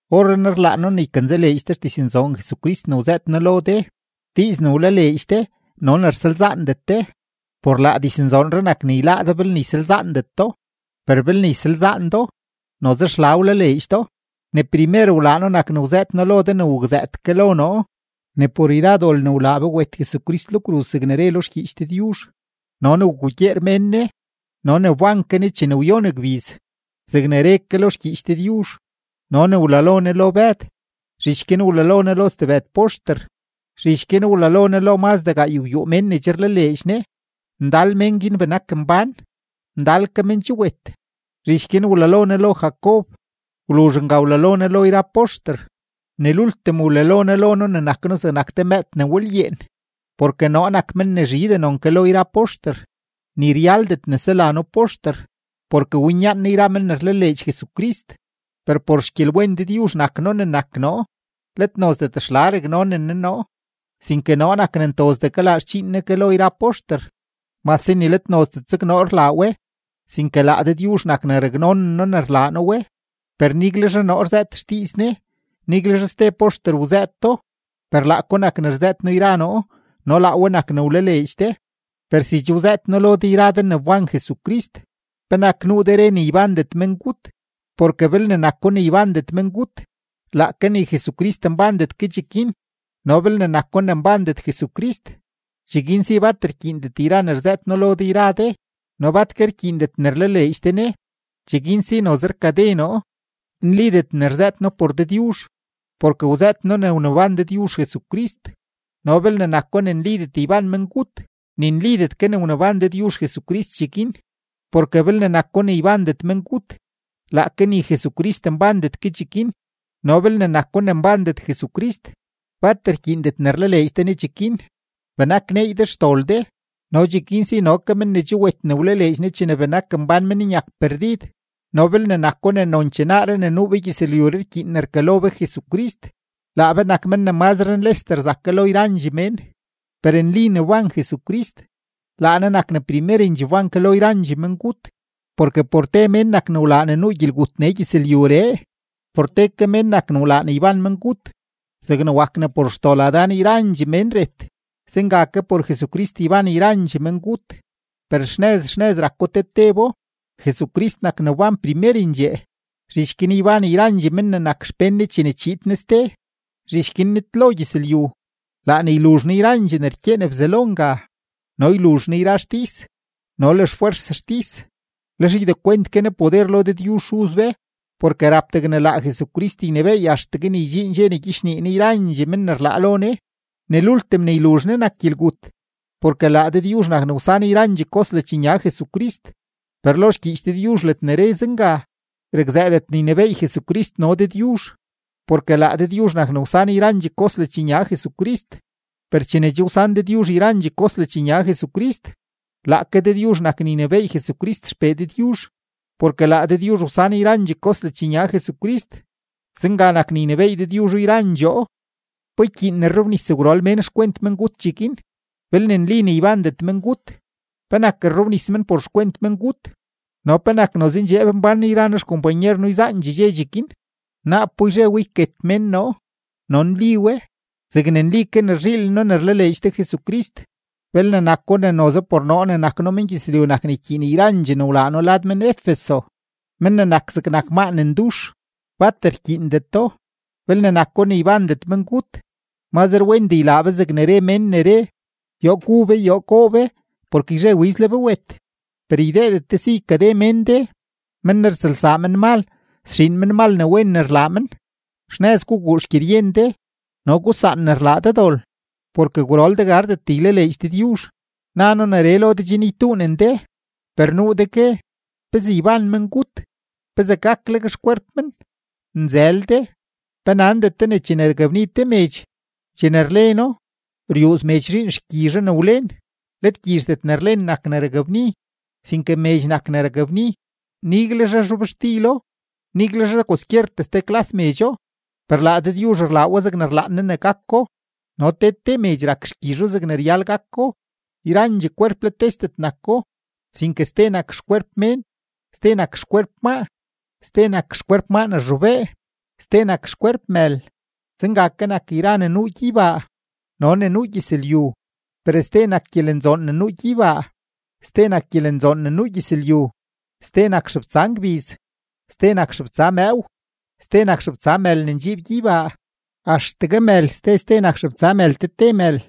Orrenaa rlaan noo ne ykanzaleedx de xdiznzoon Jesucrist ne wzëët noo lo de, diiz ne wlaleedx de no ne rsalzaandet de. Por laa diznzoonree nak ne yláá de belne ysalzaandet do, per belne ysalzaan do, noze xla wlaleedx do. Ne primer wlaa noo nak ne wzëët noo lo de ne wakzëët ke lo noo, ne por yra dol ne wlaa be wet Jesucrist lo kruz zegne re lo xgyiich Dëdyuzh, no ne wgugyeer mén Ne, no ne wban ke Ne chene wyon gbiz zegne re ke lo xgyiich Dëdyuzh, no ne wlalo Ne lo Bëd, zhich guin wlalo Ne lo stebëd poxter. Zhich guin wlalo Ne lo mazdee gaaygwyuu mén ne che rlaleedx Ne. Ndal men guin benak mbán, ndal ke men che wet. Zhich guin wlalo Ne lo Jacob, wluzh nga wlalo Ne lo yra poxter. Ne lultim wlalo Ne lo noo ne nak noo zegnak te mëëd ne walyeen. Porke noo nak men ne zhidee non ke lo yra poxter, ni ryaldet ne sela noo poxter, porke winyaan noo yra men ne rlaleedx Jesucrist. Per por xgyelwen Dëdyuzh nak noo ne nak noo; let nozdet xla raknonen Ne noo, sinke noo nak ne ntozdee kalaa xdxiin Ne ke lo yra poxter, mase ni let nozdet zeg noo rlaa we, sinke laa Dëdyuzh nak ne raknonen noo ne rlaa noo we. Per niguelzhe noo rzëët xdiiz Ne, niguelzhe ste poxter wzëëto, per laako nak ne rzëët noo yra noo no laa we nak ne wlaleedx de. Per si che wzëët noo lo de yra de ne wban Jesucrist, ¿penak nuu de re ne ybandet mengut? Porke belne nako ne ybandet mengut, laake ni Jesucrist nbandet ke cheguin. No belne nako ne nbandet Jesucrist, cheguin si bat rkyiindet yra ne rzëët noo lo de yra de no bat ke rkyiindet ne rlaleedx de Ne, cheguin si noze rkade noo, nlidet ne rzëët noo por Dëdyuzh, porke wzëët noo ne wneban Dëdyuzh Jesucrist. No belne nako ne nlidet yban mengut, ni nlidet ke ne wneban Dëdyuzh Jesucrist cheguin. Porke belne nako ne ybandet mengut, laake ni Jesucrist nbandet ke cheguin. No belne nako ne nbandet Jesucrist, bat rkyiindet ne rlaleedx de Ne cheguin, benak neey de xdol de, no cheguin si no ke men ne che wet ne wlaleedx Ne chene benak mbán men nyak perdid. No belne nako ne nonchee naaree ne nuu be gyëzlyuree rkyiin ne rkalo be Jesucrist, laa be nak men ne mazre nlesdee rzak ke lo yrandxee mén. Per nli ne wban Jesucrist; laa Ne nak ne primerendxee wban ke lo yrandxee mengut. Porke por te mén nak ne wlaa ne nuu gyelgut nee gyëzlyuree, por te ke mén nak ne wlaa ne yban mengut. Zegne wak ne por xdol Adán yrandxee mén ret, zenga ke por Jesucrist yban yrandxee mengut. Per xnëz xnëz rako te tebo: Jesucrist nak ne wban primerendxee, zhich guin yban yrandxee men ne nak xpén Ne chene chiid Ne ste. Zhich guin nitlo gyëzlyu, laa ne yluzh Ne yrandxee ne rkyeen Bzelo nga, no yluzh Ne yra xtis no le xfwers xtis; lex ydekwent ke Ne poder lo Dëdyuzh Xuz be. Porke rap degne laa Jesucrist ynebééy axtegue ne ydxiin dxe ne gyichnii Ne yrandxee mén ne rlaa lo Ne; ne lultim ne yluzh Ne nak gyelgut. Porke laa Dëdyuzh nak ne wsan yrandxee kos ledxnya Jesucrist, per lo xgyiich Dëdyuzh ledne re zenga, rakzëëdet ne ynebééy Jesucrist no Dëdyuzh, porke laa Dëdyuzh nak ne wsan yrandxee kos ledxnya Jesucrist. Per chene che wsan Dëdyuzh yrandxee kos ledxnya Jesucrist, laake Dëdyuzh nak ne ynebééy Jesucrist XPee Dëdyuzh, porke laa Dëdyuzh wsan yrandxee kos ledxnya Jesucrist. Zenga nak ne ynebééy Dëdyuzho yrandxoo. ¿Pa ykyiin ne rrobnis gwrol mén por xkwent mengut cheguin? Belne nli ne ybandet mengut, ¿penak rrobnis men por xkwent mengut? ¿No penak noze ndxeeb mbán noo yra noo xkompanyer noo yzaandxee dxe cheguin? Naapo yzhe we yket mén noo; no nli we zegne nli ke ne rzhiilen noo ne rlaleedx de Jesucrist. Belne nako ne noze por noo ne nak noo mengyëzlyu nak ne ykyiin yrandxee ne wlaa noo lad men-Efeso, men ne nak zegnak maa ne ndux, bat rkyiindeto. Belne nako ne ybandet mengut, mazre wendee ylaa be zegne re mén ne re: “Yoo gu be, yoo goo be, porke yzhe wiz le be wet.” Per ydeedet de si ykade mén de: “Men ne rtsëlsaa menmal, sxiin menmal ne wen ne rlaa men.” Xnëz guguu xgyeryen de no gusaan ne rlaa de dol, porke gwrol de gardet ylaleedx Dëdyuzh. Na noo neree lo de chen ytuunen de. Per nuu de gue: “¿Pezee yban mengut? ¿Pezee gakleg xkwerp men?” ¡Nzël de! ¿Pe nandet de ne chene rakbni te medx, chene rleno, ryuuz medx zhiin xgyizho ne wlen? Let gyizhdet ne rlen nak ne rakbni, sinke medx nak ne rakbni, niguelzhe zhobxtilo, niguelzhe kwaskyer ste klas medxo. Per laa Dëdyuzh rlaa we zegne rlaan Ne ne gako, no te te medx rak xgyizho zegne ryal gako. Yrandxee kwerp let tesdet nako, sinke ste nak xkwerp mén, ste nak xkwerp maa, ste nak xkwerp maa ne rzhobee, ste nak xkwerp mël. Zenga ke nak yra ne nuu gyeybaa no ne nuu gyëzlyu, per ste nak gyelenzoon ne nuu gyeybaa, ste nak gyelenzoon ne nuu gyëzlyu. Ste nak xebtsa ngbiz, ste nak xebtsa mëëw, ste nak xebtsa mël ne ndxiib gyeybaa; axtegue mël, ste ste nak xebtsa mël te te mël.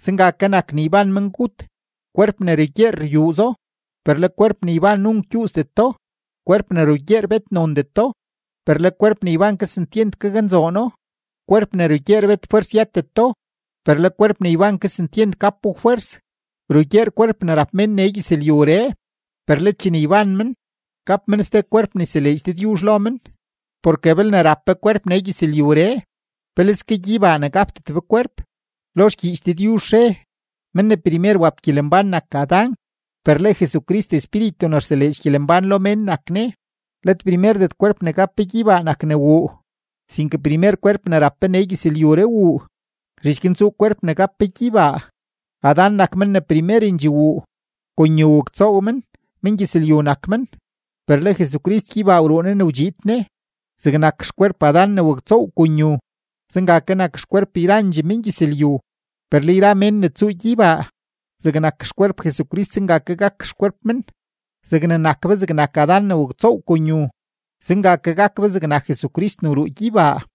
Zenga ke nak ne yban mengut. Kwerp ne rugyeer ryuuzo, per le kwerp ne yban nunk gyuuzdeto. Kwerp ne rugyeer bet nondeto, per le kwerp ne yban kesentyent gaknzoono. Kwerp ne rugyeer bet fwers yëteto, per le kwerp ne yban kesentyent gapo fwers. Rugyeer kwerp ne rap mén nee gyëzlyuree, per le chene yban men, gap men ste kwerp ne yseleedx Dëdyuzh lo men. Porke belne rap be kwerp nee gyëzlyuree, peleske gyeybaa ne gapdet be kwerp. Lo xgyiich Dëdyuzh re: “Mén ne primer wap gyelembán nak Adán”; per le Jesucrist espíritu ne rseleedx gyelembán lo mén nak Ne. Let primerdet kwerp ne gap be gyeybaa nak ne wuu, sinke primer kwerp ne rap be nee gyëzlyuree wuu; zhich guin tsuu kwerp ne gap be gyeybaa. Adán nak men ne primerendxee wuu, kon yu waktsoow men, mengyëzlyu nak men, per le Jesucrist gyeybaa wruu Ne ne wdxiid Ne. Zegnak xkwerp Adán ne waktsoow kon yu, zenga ke nak xkwerp yrandxee mengyëzlyu; per le yra mén ne tsuu gyeybaa, zegnak xkwerp Jesucrist zenga ke gak xkwerp men. Zegne nak be zegnak Adán ne waktsoow kon yu, zenga ke gak be zegnak Jesucrist ne wruu gyeybaa.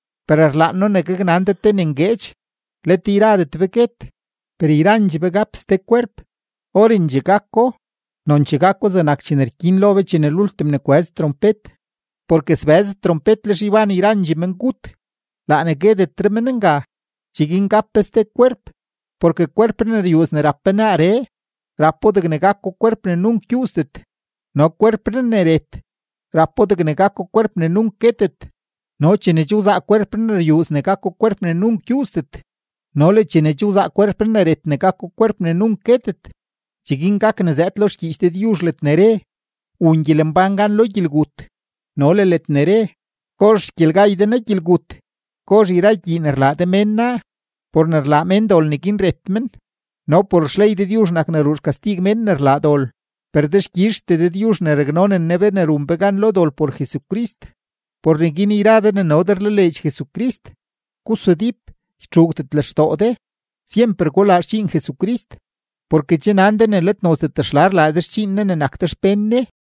Per rlaan noo ne gaknan de te ne ngueedx: Let yradet be guet, per yrandxee be gap ste kwerp; orendxee gako, nonchee gako zegnak chene rkyin lo be chene lultim ne kwëz trompet. Porke sbëz trompet, lex yban yrandxee mengut, laa ne guetetre men nga, cheguin gap be ste kwerp. Porke kwerpree ne ryuuz ne rap be naaree, rapo degne gako kwerp ne nunk gyuuzdet, no kwerpree ne ret, rapo degne gako kwerp ne nunk guetet. No chene che wzaa kwerpree ne ryuuz ne gako kwerp ne nunk gyuuzdet no le chene che wzaa kwerpree ne ret ne gako kwerp ne nunk guetet, cheguin gak ne zëëd lo xgyiich Dëdyuzh ledne re: “Wun gyelembán gan lo gyelgut” no le ledne re: “¿Gozh xgyelgay de naa gyelgut? ¿Gozh yra gyii ne rlaa de mén naa?” Por ne rlaa mén dol, neguin ret men, no por xley Dëdyuzh nak ne ruu xkastig mén ne rlaa dol. Per dexkyizhtee Dëdyuzh ne raknonen Ne be ne run be gan lo dol por Jesucrist. Por neguin yra de ne no de rlaleedx Jesucrist, gusudíp, ytxuugdet lextoo de, syemper gulaa xdxiin Jesucrist, porke che nan de ne let nozdet xla rlaa de xdxiin Ne ne nak de xpén Ne.